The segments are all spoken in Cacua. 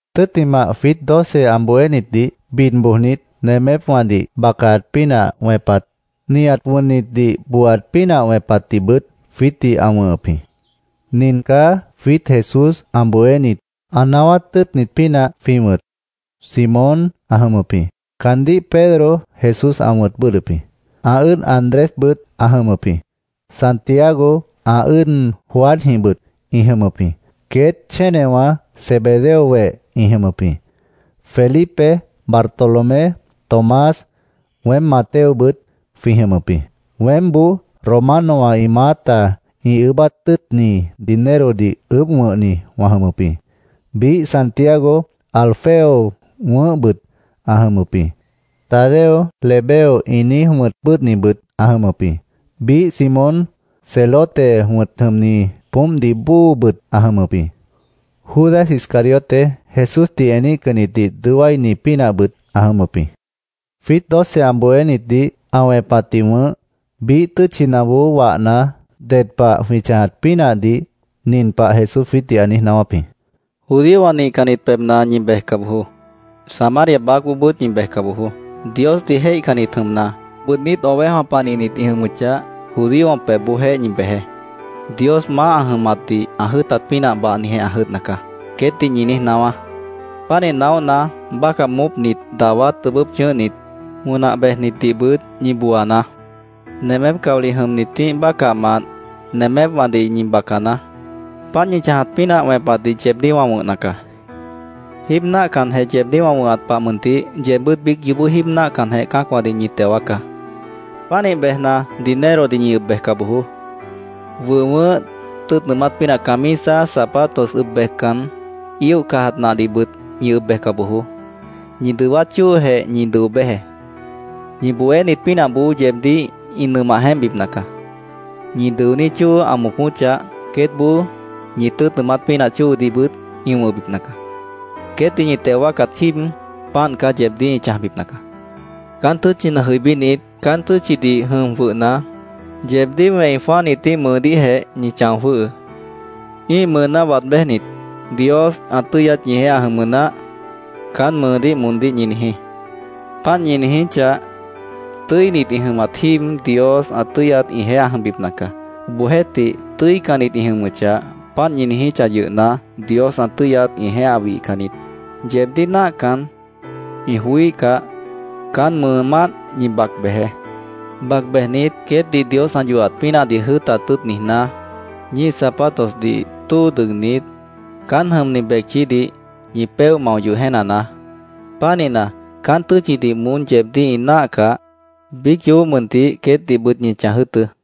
Tʉ́ttimah, jwiít doce ã bohénitdih bid bojnit, nemépwãdih bacaat pínah wẽpat, nihat wʉnnitdih booaat pínah wẽpatdihbʉt jwiítdih ã wʉ̃hʉp jĩ. Nin caá jwiít Jesús ã bohénit, ã naáwát tʉ́ʉtnit pínah jwĩ wʉ̃t: Simón ã jʉmʉp jĩ. Caandíh Pedro Jesús ã wʉ̃t bʉ́ʉdhdʉp jĩ. Ã ʉ́ʉd Andrésbʉt ã jʉmʉp jĩ. Santiago, ã ʉ́ʉd Juanjĩhbʉt ĩ jʉmʉp jĩ. Queét chénewã Zebedeo weh ĩ jʉmʉp jĩ. Felipe, Bartolomé, Tomás, weém Mateobʉt jwĩ jʉmʉp jĩ. Weémboó Romanowã ĩ maáta ĩ ʉʉ́bát tʉ́ʉtni dinerodih ʉʉ́bh wʉ̃hni wã jʉmʉp jĩ. Biíh Santiago, Alfeo wʉ̃ʉ́hbʉt ã jʉmʉp jĩ. Tadeo, Lebeo ĩ niíj wʉ̃t bʉ́ʉdhnibʉt ã jʉmʉp jĩ. Biíh Simón, Celote wʉ̃t jʉmni poómpdih bóobʉt ã jʉmʉp jĩ. Judas Iscariote, Jesúsdih eníhcannitdih dʉó wáini pínahbʉt ã jʉmʉp jĩ. Jwiít doce ã bohénitdih ã wẽpatdih wʉ̃h, biíh tʉ́tchinaboó wahna, ded pah jwĩ chãjat pínahdih nin pah Jesús jwiítdih ã niíj naáwáp jĩ: “Judíowã nihcannit pebhna ñi bejca bojoó. Samaria baácboobʉ́t ñi bejca bojoó. Diosdih jéihcannit jʉmna, bʉʉdnít ovejawã panihnit ĩ jʉmʉchah, judíowã pebhboojéh ñi bejeé. ‘Dios maáh ã jʉmatdih ã jʉ́ʉtat pínah bahnijeh ã jʉdhna caá’, queétdih ñi niíj naáwá. Pánih naóhna, bácah moópnit, dawá tʉbʉ́p chʉ̃ʉ́hnit, wʉnah bejnitdihbʉt ñi booanaá. Nemép caolih jʉmnitíh bácahmant nemépwãdih ñi bacanaá. Páant ñi chãjat pínah wẽpatdih yeebdíh wã wʉ̃hna caá. Jíib náahcanjeh yeebdíh wã wʉ̃hat pah mʉntih, yeebbʉ́t biíc yoobó jíib náahcanjeh cã́acwãdih ñi teo wáacá. “Pánih bejna, dinerodih ñi ʉb bejca bojoó. Wʉh wʉʉ́h, tʉ́ʉt nʉʉmát pínah camisa, zapatos ʉb bejcan, íoh cajat nahdihbʉt ñi ʉb bejca bojoó. Ñi dʉwát chóojeh ñi dʉo béjeé. Ñi bohénit pínahboó yeebdíh ĩ nʉmah jeémpbipna caá. Ñi dʉoní chóo ã moopóchah, queétboó ñi tʉ́ʉt nʉʉmát pínah chóodihbʉt ĩ wʉ̃hbipna caá. Queétdih ñi teo wáacat jíib, páant caá yeebdíh ĩ chãjbipna caá. “Caán tʉ́tchina jʉibínit, caán tʉ́tchidih jʉm jwʉhna, yeebdíh wẽi jwãáhnitíh mʉʉdíhjeh ñi chão jwʉ́hʉʉ́. Ĩ́ih mʉʉná waad béjnit, ‘Dios ã tʉ́yat ñijeéh ã jʉmʉ naáh’, caán mʉʉdíh moondíh ñi niijí. Páant ñi niijíchah, tʉ́init ĩ jʉmat jíib, Dios ã tʉ́yat ĩjeéh ã jʉmbipna caá. Obohjeéhtih, tʉ́icannit ĩ jʉmʉchah, páant ñi niijíchah yʉhna, Dios ã tʉ́yat ĩjeéh ã wihcan niít. Yeebdíh náahcan, ĩ joííhcah, caán mʉʉmánt ñi bac bejeé. Bac bejnit, queétdih Dios ã yohat pínahdih jʉ́ʉtat tʉ́ʉt niijná, ñíih zapatosdih tóo dʉgnit, caán jʉmni becchídih ñi péoh mao yoh jéenanaá. Pánihna, caán tʉ́tchidih moón yeebdíh ĩ náahcah, biíc yoobó mʉntih queétdihbʉt ñi chãj jʉ́ʉtʉ́.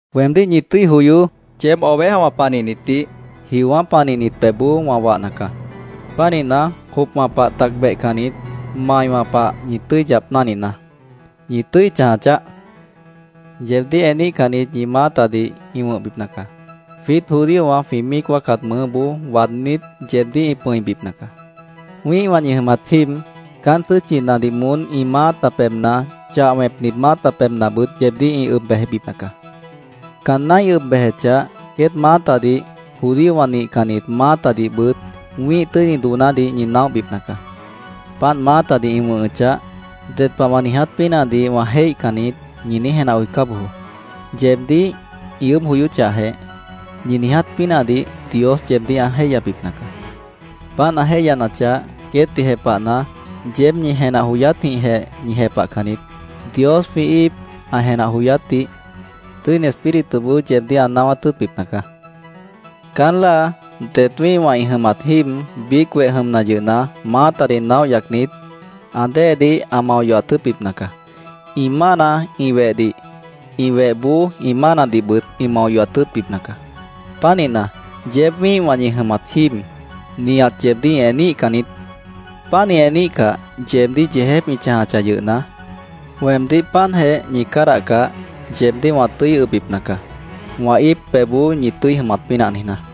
“¡Weemdíh ñi tʉ́i joyoó! Yeéb ovejawã panihnitdih jiowã́ panihnit pebhboó wã wahna caá. Pánihna, jopwã pah tac behcannit, maiwã pah ñi tʉ́i yap náhninaá. ¡Ñi tʉ́i chãja chaáh! Yeebdíh eníhcannit ñi maátadih ĩ wʉ̃hbipna caá. Jwiít judíowã jwĩ míic wáacat mʉʉ́boó waadnít, yeebdíh ĩ pʉ̃ibipna caá. Wĩ́ihwã ñi jʉmat jíib, caán tʉ́tchinadih moón ĩ maáta pebhna, chah wẽpnit maáta pebhnabʉt yeebdíh ĩ ʉb bejbipna caá. Caanná ĩ ʉb bejechah, queét maátadih, judíowã nihcannit maátadihbʉt wĩ́ih tʉ́ini doonádih ñi naóhbipna caá. Páant maátadih ĩ wʉ̃hʉchah, ‘Ded pah wã niiját pínahdih wã jéihcan niít’, ñi niíj jenah joicá bojoó. Yeebdíh ĩ ʉʉ́bh joyóchahjeh, ñi niiját pínahdih Dios yeebdíh ã jéihyabipna caá. Páant ã jéihyanachah, queétdih jepahna, yeéb ñi jenah joyátjĩhjeh ñi jepahcan niít. Dios jwĩ íip ã jenah joyátdih Tʉ́ini Espírituboó yeebdíh ã naáwát tʉ́ʉtbipna caá. “Caán láa, det wĩ́ihwã ĩ jʉmat jíib, biíc weh jʉmna yʉhna, maátadih naóh yacnit, ã déedih ã mao yohat tʉ́ʉtbipna caá. Ĩ mána ĩ wehdih, ĩ wehboó ĩ mánadihbʉt ĩ mao yohat tʉ́ʉtbipna caá. Pánihna, yeéb wĩ́ihwã ñi jʉmat jíib, nihat yeebdíh ĩ eníhcan niít. Páant ĩ eníhcah, yeebdíh yeejép ĩ chãjachah yʉhna, weemdíh páantjeh ñi cádahcah, yeebdíh wã tʉ́i ʉbbipna caá, wã íip pebhboó ñi tʉ́i jʉmat pínah niijná.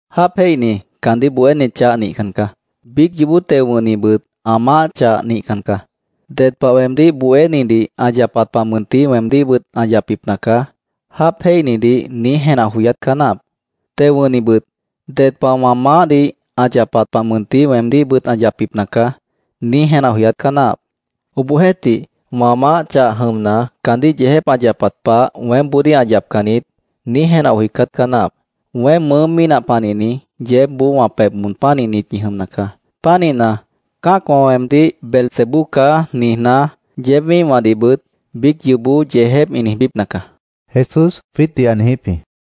“Jáap jéihni caandíh bohéni chah nihcan caá. Biíc yoobó teo wʉ̃hnibʉt ã maáh chah nihcan caá. ‘Ded pah weemdíh bohénidih ã yapat pah mʉntih weemdíhbʉt ã yapbipna caá’, jáap jéihnidih niíj jenah joyát caá náahap. Teo wʉ̃hnibʉt ‘Ded pah wã maáhdih ã yapat pah mʉntih weemdíhbʉt ã yapbipna caá’, niíj jenah joyát caá náahap. Obohjeéhtih, ‘Wã maáh chah jʉmna, caandíh yeejép ã yapat pah weémboodíh ã yapcan niít’, niíj jenah joicát caá náahap. Weém mʉʉ́ mínah panihni, yeébboó wã pebh moon pánihnit ñi jʉmna caá. Pánihna, cã́acwã weemdíh ‘Beelzebú caá’, niijná, yeéb wĩ́ihwãdihbʉt biíc yoobó yeejép ĩ niijbípna caá”, Jesús jwiítdih ã niijíp jĩ.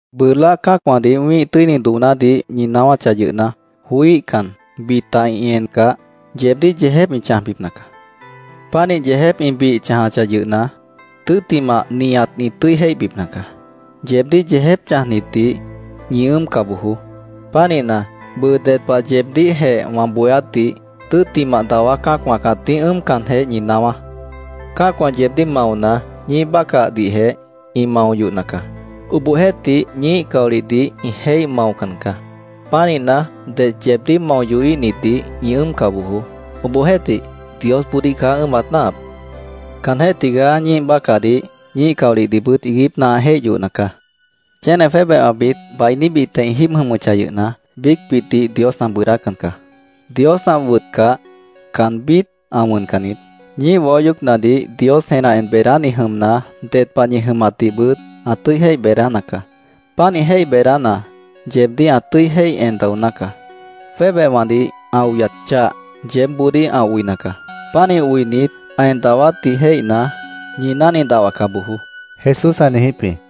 “Bʉʉ láa cã́acwãdih wĩ́ih tʉ́ini doonádih ñi naáwáchah yʉhna, joííhcan, bita ĩ encah, yeebdíh yeejép ĩ chãjbipna caá. Pánih yeejép ĩ bih chãjachah yʉhna, tʉ́ttimah nihat ĩ tʉ́i jéihbipna caá. Yeebdíh yeejép chãjnitdih ñi ʉ́ʉmca bojoó. Pánihna, bʉʉ ded pah yeebdíhjeh wã bohéátdih tʉ́ttimah dawá cã́acwã cãtíh ʉ́ʉmcanjeh ñi naáwá. Cã́acwã yeebdíh maona, ñíih bácahdihjeh ĩ mao yohna caá. Obohjeéhtih, ñíih caolihdih ĩ jéih maocan caá. Pánihna, det yeebdíh mao yohíhnitdih ñi ʉ́ʉmca bojoó. Obohjeéhtih, Diosboodíh caá ʉ́ʉmat náahap. Caanjéh tigaá ñíih bácahdih, ñíih caolihdihbʉt iiguípna ã jéih yohna caá. “Chéne jwébehwãbit bainíbitjeh ĩ jíib jʉmʉchah yʉhna, biícbitdih Dios ã bʉʉdácan caá. Dios ã wʉtcah, caanbít ã wʉncan niít. Ñíih waó yoócnadih Dios jenah en beedáni jʉmna, ded pah ñi jʉmatdihbʉt ã tʉ́i jéih beedána caá. Pánih jéih beedána, yeebdíh ã tʉ́i jéih en daoná caá. Jwébehwãdih ã oyat chah, yeébboodíh ã oina caá. Pánih oinit, ã en dawátdih jéihna, ñi náhni dahwaca bojoó”, Jesús ã niijíp jĩ.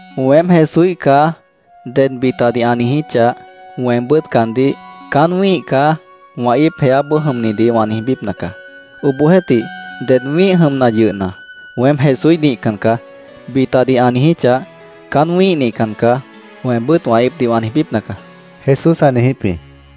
“ ‘Weém Jesúíh caá’, ded bitadih ã niijíchah, weembʉ́t caandíh ‘Caán wĩ́ih caá’, wã íip jeáboó jʉmnidih wã niijbípna caá. Obohjeéhtih, ded wĩ́ih jʉmna yʉhna, ‘Weém Jesúíh nihcan caá’, bitadih ã niijíchah, ‘Caán wĩ́ih nihcan caá’, weembʉ́t wã íipdih wã niijbípna caá”, Jesús ã niijíp jĩ.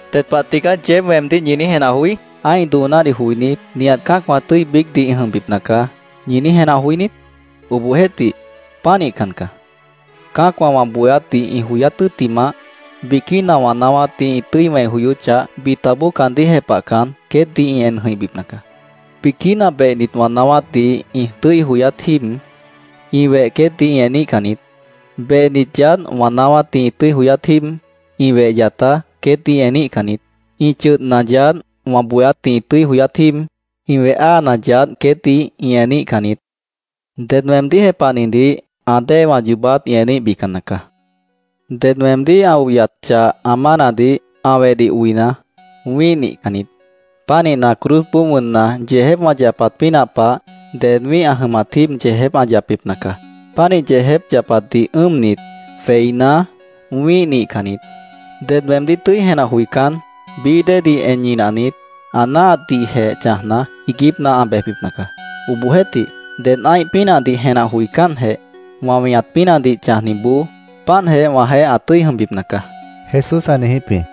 “¿Ded pah tigaá yeéb weemdíh ñi niíj jenah joí? ‘Ã́ih doonádih joinít, nihat cã́acwã tʉ́i biícdih ĩ jʉmbipna caá’, ¿ñi niíj jenah joí niít? Obohjeéhtih, pánihcan caá. Cã́acwã wã bohéátdih ĩ joyát tʉ́ttimah, biquína wã naáwátdih ĩ tʉ́i wẽi joyóchah, bitaboó caandíh jepahcan, queétdih ĩ en jʉ̃ihbipna caá. Biquína behnit wã naáwátdih ĩ tʉ́i joyát jíib ĩ weh queétdih ĩ eníhcan niít. Behnit yaádh wã naáwátdih ĩ tʉ́i joyát jíib ĩ weh yatá queétdih ĩ eníhcan niít. Ĩ chʉdhna yaádh wã bohéátdih ĩ tʉ́i joyát jíib, ĩ weh áana yaádh queétdih ĩ eníhcan niít. Ded weemdíh jepahnidih ã déewã yoobát ĩ eníhbican nacaá. “Ded weemdíh ã oyat chah ã mánadih, ã wehdih oina, wĩ́ih nihcan niít. Pánihna, cruzboó wʉnna, yeejép wã yapat pínah pah, ded wĩ́ih ã jʉmat jíib yeejép ã yapbipna caá. Pánih yeejép yapatdih ʉ́ʉmnit, jweiná, wĩ́ih nihcan niít. Ded weemdíh tʉ́i jenah joicán, bií déedih en ñinahnit, ã náahatdihjeh chãjna, iiguípna ã bejbipna caá. Obohjeéhtih, ded ã́ih pínahdih jenah joicánjeh, wã weñat pínahdih chãjniboó páantjeh wãjeéh ã tʉ́i jʉmbipna caá”, Jesús ã niijíp jĩ.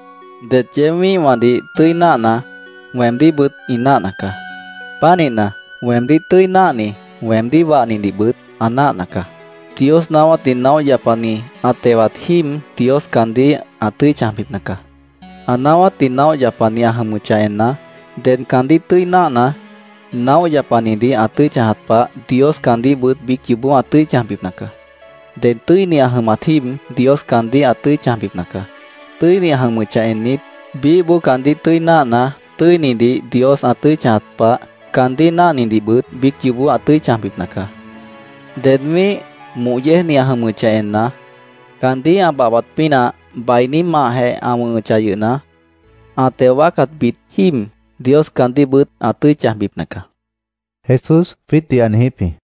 “Det yeéb wĩ́ihwãdih tʉ́i náahna, weemdíhbʉt ĩ náahna caá. Pánihna, weemdíh tʉ́i náahni weemdíh wahnidihbʉt ã náahna caá. Dios naáwátdih naóh yapani ã tewat jíib Dios caandíh ã tʉ́i chãjbipna caá. Ã naáwátdih naóh yapani ã jʉmʉchah enna, ded caandíh tʉ́i náahna, naóh yapanidih ã tʉ́i chãjat pah Dios caandíhbʉt biíc yoobó ã tʉ́i chãjbipna caá. Ded tʉ́ini ã jʉmat jíib, Dios caandíh ã tʉ́i chãjbipna caá. Tʉ́ini ã jʉmʉchah ennit, biíhboó caandíh tʉ́i náahna, tʉ́inidih Dios ã tʉ́i chãjat pah, caandíh náahnidihbʉt biíc yoobó ã tʉ́i chãjbipna caá. Ded wĩ́ih moh yéejni ã jʉmʉchah enna, caandíh ã babhbat pínah, bainí mahjeh ã wʉ̃hʉchah yʉhna, ã teo wáacatbit jíib, Dios caandíhbʉt ã tʉ́i chãjbipna caá”, Jesús jwiítdih ã niijíp jĩ.